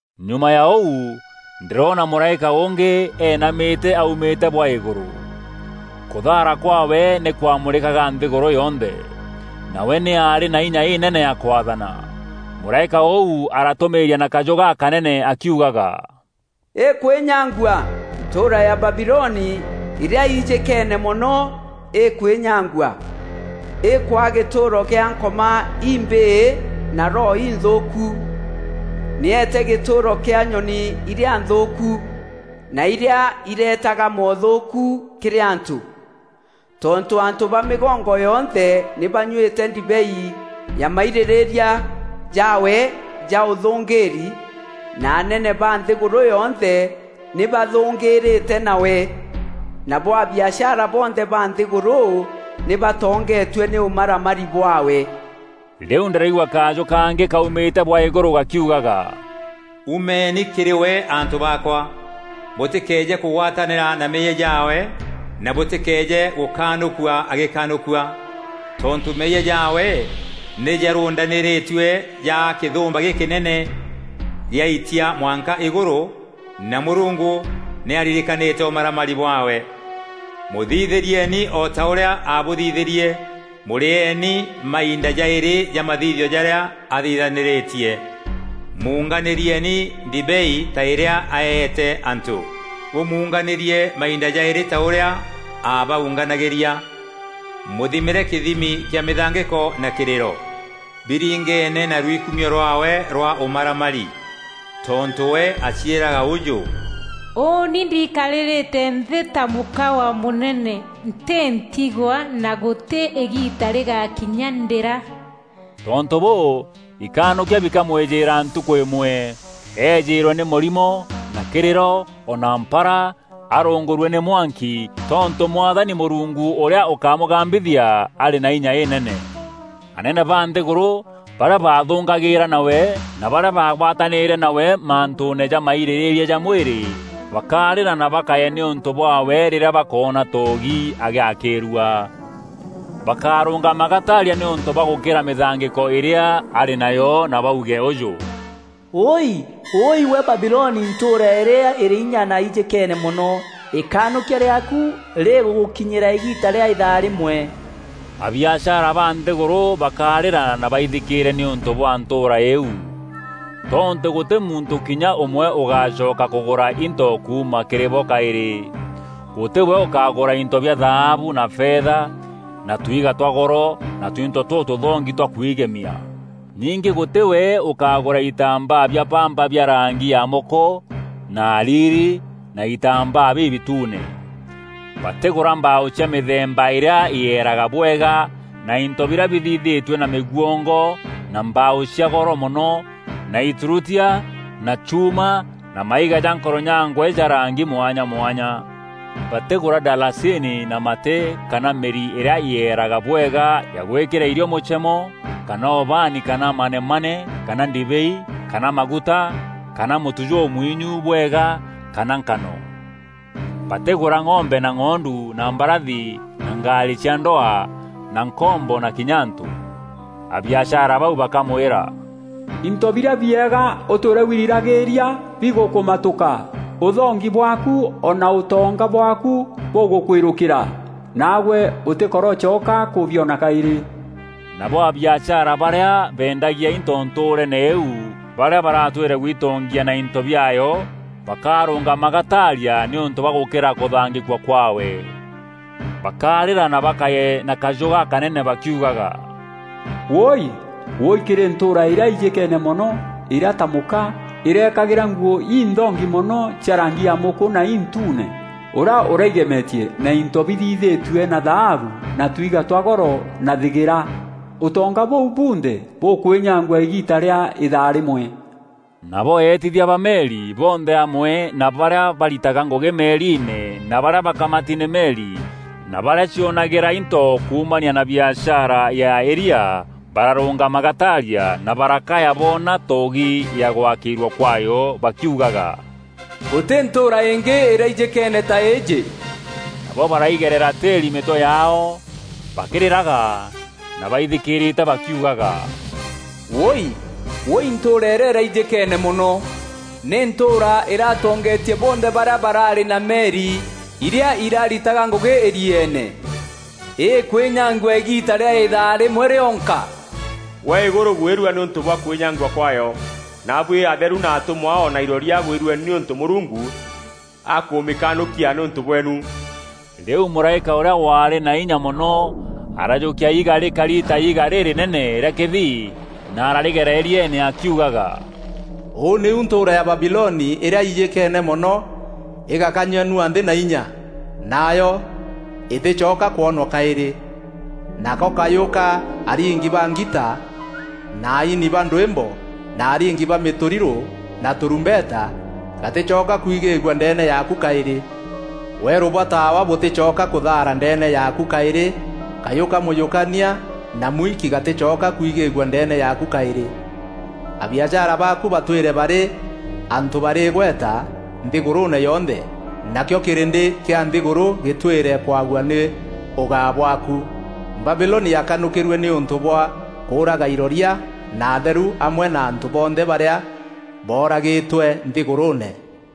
Nyuma ya ûu ndîroona mûraîka ûngî eenamîte aumîte bwa îgûrû. Kûthaara kwaawe nî kwamurîkaga nthîgûrû yonthe. Nawe nî aarî na inya înene ya kwaathana. Mûraîka ûu aratûmîîria na kajû gakanene akiugaga, “Îkwînyangua! Ntûûra ya Babiloni îrîa ijîkeene mono îkwînyangua! Îkwaa gîtûûro kîa Nkoma imbîî na roho inthûûku, nî îeete gîtûûro kîa nyoni irîa nthûûku, na irîa ireetaga moothûûku kîrî antû. Tontû antû ba mîgongo yonthe nî banyuîte ndibei ya mairîrîîria jaawe ja ûthûngîîri, na anene ba nthîgûrû yonthe nî bathûngîîrîte nawe, nabo abiashara bonthe ba nthîgûrû nî batongetue nî ûmaramari bwaawe.” Rîu ndîraigua kajû kangî kaumîte bwa îgûrû gakiugaga, “Umeeni kîrî we antû baakwa! Bûtîkeeje kûgwatanîra na meeyia jaawe, na bûtîkeeje gûkanûkua agîkanûkua! Tontû meeyia jaawe nî jarûndanîrîtue jaa kîthûmba gîkînene gîaitia mwanka îgûrû, na Mûrungu nî aririkanîte ûmaramari bwaawe. Mûthithîrieeni o ta ûrîa abûthithîrîe mûrîeeni mainda jaîrî ja mathithio jarîa athithanîrîtie. Munganîrieeni ndibei ta îrîa aeete antû, bûmunganîrie mainda jaîrî ta ûrîa aabaunganagîria. Mûthimîre kîthimi kîa mîthangîko na kîrîro, biringeene na rwikumio rwaawe rwa ûmaramari. Tontû we aciîraga ûjû: ‘Ûûni ndiikarîrîte nthî ta mûka wa mûnene, ntî ntigwa na gûtî îgiita rîgakinya ndîra!’ Tontû bûû ikanûkia bikamwîjîîra ntukû îmwe, Ejîîrwe nî mûrimo na kîrîro o na mpara, arungûrue nî mwanki, tontû Mwathani Mûrungu ûrîa ûkamûgambîthia arî na inya înene.” Anene ba nthîgûrû, barîa baathûngagîîra nawe, na barîa baagwatanîre nawe mantûûne ja mairîrîîria ja mwîrî bakarîra na bakaye nîûntû bwaawe rîrîa bakoona toogi agîakîîrua. Bakarûngama gataaria nîûntû bwa gûkîra mîthangîko îrîa arî nayo na bauge ûjû: “Wûûi! Wûûî gwe Babiloni ntûûra îrîa îrî inya na ijîkeene mono! Îkanûkia rîaaku rîgûgûkinyîra îgiita rîa îthaa rîmwe.” Abiashara ba nthîgûrû bakarîra na baithikîîre nîûntû bwa ntûûra îîu. Tontû gûtî muntû kinya ûmwe ûgacoka kûgûra into kuuma kîrî bo kaîrî. Gûtî we ûkagûûra into bia thaabu na fetha na tuiiga twa goro na tuinto tûtûthongi twa kwigemia. Ningî gûtî we ûkagûra itambaa bia bamba bia rangi ya mûkû na hariri na itambaa bibitune. Batîgûra mbaaû cia mîthemba îrîa îeeraga bwega na into birîa bithithîtue na mîgwongo na mbaaû cia goro mono na îturutia na chuuma na maiga ja nkoronyangwe ja rangi mwanya mwanya. Batîgûra ndalasini na matî kana mîri îrîa yeeraga bwega ya gûîkîra irio mûchemo kana ubaani kana manemane kana ndibei kana maguta kana mûtu jûmwinyu bwega kana nkano. Batîgûra ng'ombe na ng'ondu na mbarathi na ngaarî cia ndwaa na nkombo na kinya antû. Abiashara bau bakamwîra, “Into birîa bieega ûtwîre wirîragîîria bigûkûmatûka, ûthongi bwaaku o na ûtonga bwaaku bûgûkûîrûkîra, naagwe ûtîkorocoka kûbiona kaîrî!” Nabo abiashara barîa beendagia into ntûûreene îîu barîa baratwîre gwitongia na into biaayo, bakarûngama gataaria nîûntû bwa gûkîîra kûthangîkua kwaawe. Bakarîra na bakaye na kajû gakanene bakiugaga, “Wûûi, wûûi Kîrî ntûûra îrîa ijîkeene mono îrîa ta mûka, îrekagîra nguû inthongi mono cia rangi ya mûkû na intuune, ûrîa ûraigemetie na into bithithîtue na thaabu na tuiiga twa goro na thîgîra. Ûtonga bûu bunthe bûkwînyangua îgîîta rîa îthaa rîmwe.” Nabo eetithia ba meri bonthe amwe na barîa baritaga ngûgî meeriine na barîa bakamati nî meri na barîa cionagîra into kuumania na biashara ya îria bararûngama gataaria, na barakaya boona toogi ya gwakîîrua kwaayo bakiugaga, “Gûtî ntûûra îngî îraijîkeene ta îîjî” Nabo baraigerera tîîri mîtwe yaao bakîrîraga na baithikîrîte bakiugaga, “Wûûi, wûûi ntûûra îrîa îraijîkeene mono! Nî ntûûra îratongetie bonthe barîa baraarî na meri irîa iraritaga ngûgî îrieene. Îkwînyangua îgiita rîa îthaa rîmwe rîonka!” Gwe îgûrû gwîrua nîûntû bwa kwînyangua kwaayo. Naabuî atheru na atûmwa o na iroria gwîrueni nîûntû Mûrungu aakûmîkanûkia nîûntû bweenu. Rîu mûraîka ûrîa waarî na inya mono arajûkia iiga rîkari ta iiga rîrînene rîa kîthii na ararîgera îrieene akiugaga, “Ûu nîu ntûûra ya Babiloni îrîa ijîkeene mono îgakanyanua nthî na inya, nayo îtîcoka kwonwa kaîrî. Nako kajû ka aringi ba ngita na aini ba ndwîmbo na aringi ba mîtûrirû na tarumbeta gatîcoka kwigîîgua ndeene yaaku kaîrî! Weerû bwa taawa bûtîcoka kûthaara ndeene yaaku kaîrî Kajû ka mûjûkania na mûiki gatîcoka kwigîîgua ndeene yaaku kaîrî. Abiashara baaku batwîre barî antû barî îgweta nthîgûrûûne yonthe nakîo kîrîndî kîa nthîgûrû gîtwîre kwaua nî ûgaa bwaaku! Babiloni yaakanûkîrue nîûntû bwa kûûraga iroria na atheru amwe na antû bonthe barîa booragîtwe nthîgûrûûne.”